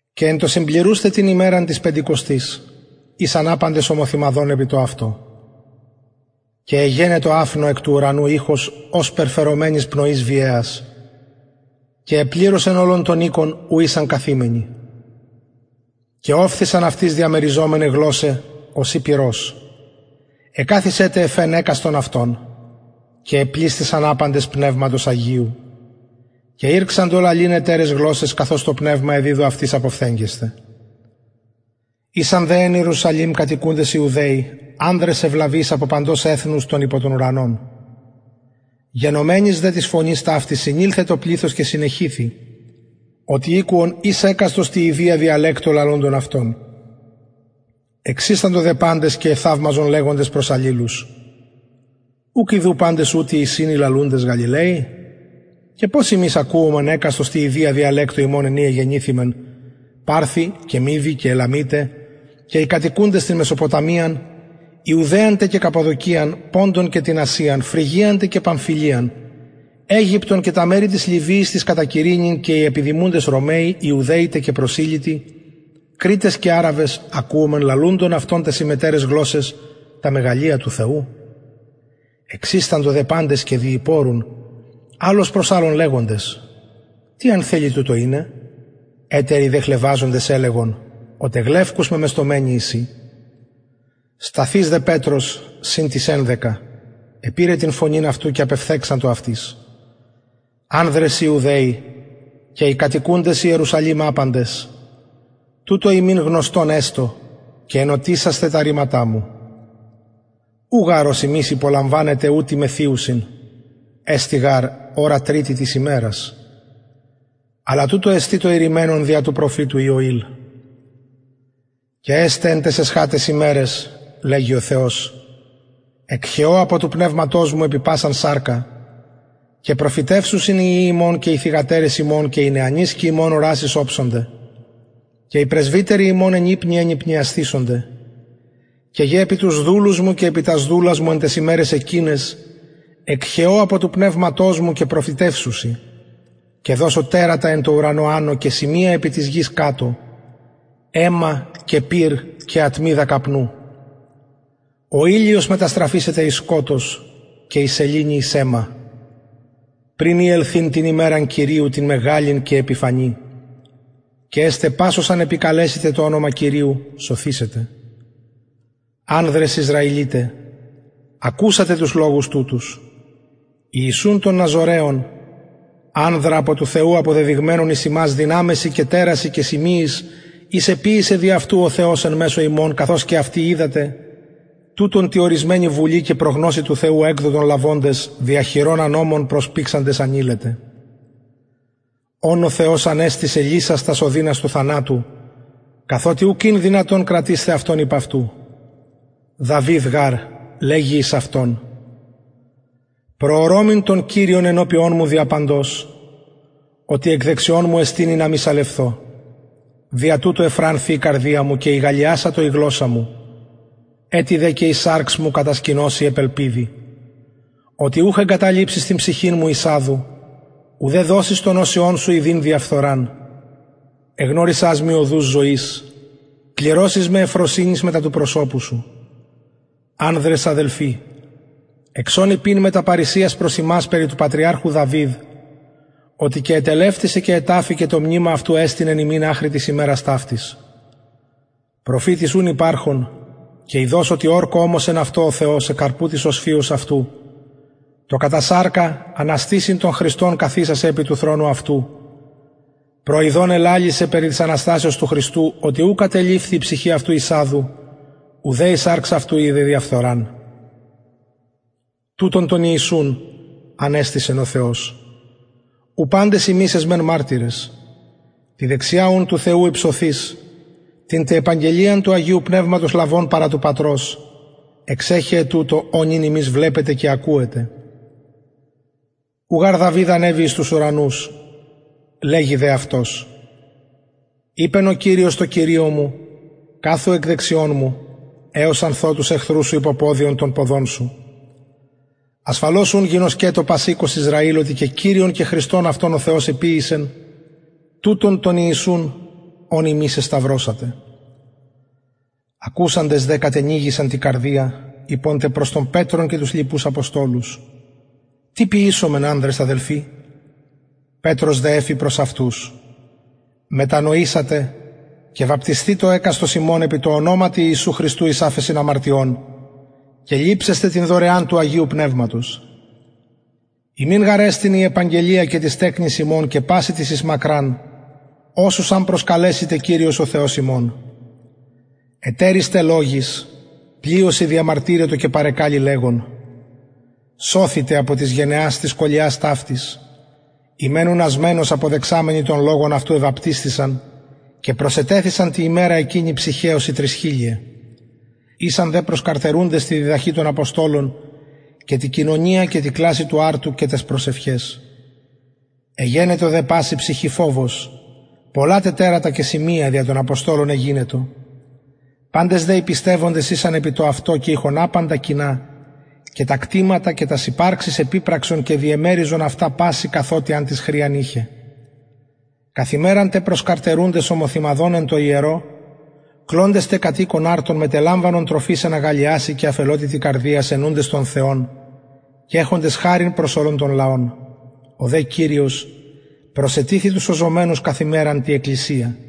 και εν τω συμπληρουσθαι την ημεραν της πεντηκοστης ησαν απαντες ομοθυμαδον επι το αυτο και εγενετο αφνω εκ του ουρανου ηχος ωσπερ φερομενης πνοης βιαιας και επληρωσεν ολον τον οικον ου ησαν καθημενοι και ωφθησαν αυτοις διαμεριζομεναι γλωσσαι ωσει πυρος εκαθισεν τε εφ ενα εκαστον αυτων και επλησθησαν απαντες πνευματος αγιου και ηρξαντο λαλειν ετεραις γλωσσαις καθως το πνευμα εδιδου αυτοις αποφθεγγεσθαι ησαν δε εν ιερουσαλημ κατοικουντες ιουδαιοι ανδρες ευλαβεις απο παντος εθνους των υπο τον ουρανον γενομενης δε της φωνης ταυτης συνηλθεν το πληθος και συνεχυθη οτι ηκουον εις εκαστος τη ιδια διαλεκτω λαλουντων αυτων εξισταντο δε παντες και εθαυμαζον λεγοντες προς αλληλους ουκ ιδου παντες ουτοι εισιν οι λαλουντες γαλιλαιοι και πως ημεις ακουομεν εκαστος τη ιδια διαλεκτω ημων εν η εγεννηθημεν παρθοι και μηδοι και ελαμιται και οι κατοικουντες την μεσοποταμιαν ιουδαιαν τε και καππαδοκιαν ποντον και την ασιαν φρυγιαν τε και παμφυλιαν αιγυπτον και τα μερη της λιβυης της κατα κυρηνην και οι επιδημουντες ρωμαιοι ιουδαιοι τε και προσηλυτοι κρητες και αραβες ακουομεν λαλουντων αυτων ταις ημετεραις γλωσσαις τα μεγαλεια του θεου εξισταντο δε παντες και διηπορουν αλλος προς αλλον λεγοντες τι αν θελοι τουτο ειναι ετεροι δε χλευαζοντες ελεγον οτι γλευκους μεμεστωμενοι εισιν σταθεις δε πετρος συν τοις ενδεκα επηρεν την φωνην αυτου και απεφθεγξατο αυτοις ανδρες ιουδαιοι και οι κατοικουντες ιερουσαλημ απαντες τουτο υμιν γνωστον εστω και ενωτισασθε τα ρηματα μου ου γαρ ως υμεις υπολαμβανετε ουτοι μεθυουσιν εστιν γαρ ωρα τριτη της ημερας αλλα τουτο εστιν το ειρημενον δια του προφητου ιωηλ και εσται εν ταις εσχαταις ημεραις λεγει ο θεος εκχεω απο του πνευματος μου επι πασαν σαρκα και προφητευσουσιν οι υιοι υμων και αι θυγατερες υμων και οι νεανισκοι υμων ορασεις οψονται και οι πρεσβυτεροι υμων ενυπνια ενυπνιασθησονται και γε επι τους δουλους μου και επι τας δουλας μου εν ταις ημεραις εκειναις εκχεω απο του πνευματος μου και προφητευσουσιν και δωσω τερατα εν τω ουρανω ανω και σημεια επι της γης κατω αιμα και πυρ και ατμιδα καπνου ο ηλιος μεταστραφησεται εις σκοτος και η σεληνη εις αιμα πριν η ελθειν την ημεραν κυριου την μεγαλην και επιφανη και εσται πας ος αν επικαλεσηται το ονομα κυριου σωθησεται ανδρες ισραηλιται ακουσατε τους λογους τουτους ιησουν τον ναζωραιον ανδρα απο του θεου αποδεδειγμενον εις υμας δυναμεσιν και τερασιν και σημειοις οις εποιησεν δι αυτου ο θεος εν μεσω υμων καθως και αυτοι οιδατε τουτον τη ωρισμενη βουλη και προγνωσει του θεου εκδοτον λαβοντες δια χειρων ανομων προσπηξαντες ανειλετε ον ο θεος ανεστησεν λυσας τας ωδινας του θανατου καθοτι ουκ ην δυνατον κρατεισθαι αυτον υπ αυτου δαυιδ γαρ λεγει εις αυτον προωρωμην τον κυριον ενωπιον μου δια παντος οτι εκ δεξιων μου εστιν ινα μη σαλευθω δια τουτο ευφρανθη η καρδια μου και ηγαλλιασατο η γλωσσα μου ετι δε και η σαρξ μου κατασκηνωσει επ ελπιδι οτι ουκ εγκαταλειψεις την ψυχην μου εις αδου ουδε δωσεις τον οσιον σου ιδειν διαφθοραν εγνωρισας μοι οδους ζωης πληρωσεις με ευφροσυνης μετα του προσωπου σου ανδρες αδελφοι εξον ειπειν μετα παρρησιας προς υμας περι του πατριαρχου δαυιδ οτι και ετελευτησεν και εταφη και το μνημα αυτου εστιν εν ημιν αχρι της ημερας ταυτης προφητης ουν υπαρχων και ειδως οτι ορκω ωμοσεν αυτω ο θεος εκ καρπου της οσφυος αυτου το κατα σαρκα αναστησειν τον χριστον καθισαι επι του θρονου αυτου προιδων ελαλησεν περι της αναστασεως του χριστου οτι ου κατελειφθη η ψυχη αυτου εις αδου ουδε η σαρξ αυτου ειδεν διαφθοραν τουτον τον ιησουν ανεστησεν ο θεος ου παντες ημεις εσμεν μαρτυρες τη δεξια ουν του θεου υψωθεις την τε επαγγελιαν του αγιου πνευματος λαβων παρα του πατρος εξεχεεν τουτο ο νυν υμεις βλεπετε και ακουετε ου γαρ δαυιδ ανεβη εις τους ουρανους λεγει δε αυτος ειπεν ο κυριος τω κυριω μου καθου εκ δεξιων μου εως αν θω τους εχθρους σου υποποδιον των ποδων σου ασφαλως ουν γινωσκετω πας οικος ισραηλ οτι και κυριον και χριστον αυτον ο θεος εποιησεν τουτον τον ιησουν ον υμεις εσταυρωσατε ακουσαντες δε κατενυγησαν τη καρδια ειπον τε προς τον πετρον και τους λοιπους αποστολους τι ποιησομεν ανδρες αδελφοι πετρος δε εφη προς αυτους μετανοησατε και βαπτισθητω εκαστος υμων επι τω ονοματι ιησου χριστου εις αφεσιν αμαρτιων και ληψεσθε την δωρεαν του αγιου πνευματος υμιν γαρ εστιν η επαγγελια και τοις τεκνοις υμων και πασιν τοις εις μακραν οσους αν προσκαλεσηται κυριος ο θεος ημων ετεροις τε λογοις πλειοσιν διεμαρτυρετο και παρεκαλει λεγων σωθητε απο της γενεας της σκολιας ταυτης οι μεν ουν ασμενως αποδεξαμενοι τον λογον αυτου εβαπτισθησαν και προσετεθησαν τη ημερα εκεινη ψυχαι ωσει τρισχιλιαι ησαν δε προσκαρτερουντες τη διδαχη των αποστολων και τη κοινωνια και τη κλασει του αρτου και ταις προσευχαις εγενετο δε παση ψυχη φοβος πολλα τε τερατα και σημεια δια των αποστολων εγινετο παντες δε οι πιστευοντες ησαν επι το αυτο και ειχον απαντα κοινα και τα κτηματα και τας υπαρξεις επιπρασκον και διεμεριζον αυτα πασιν καθοτι αν τις χρειαν ειχεν καθ ημεραν τε προσκαρτερουντες ομοθυμαδον εν τω ιερω κλωντες τε κατ οικον αρτον μετελαμβανον τροφης εν αγαλλιασει και αφελοτητι καρδιας αινουντες τον θεον και εχοντες χαριν προς ολον τον λαον ο δε κυριος προσετιθει τους σωζομενους καθ ημεραν τη εκκλησια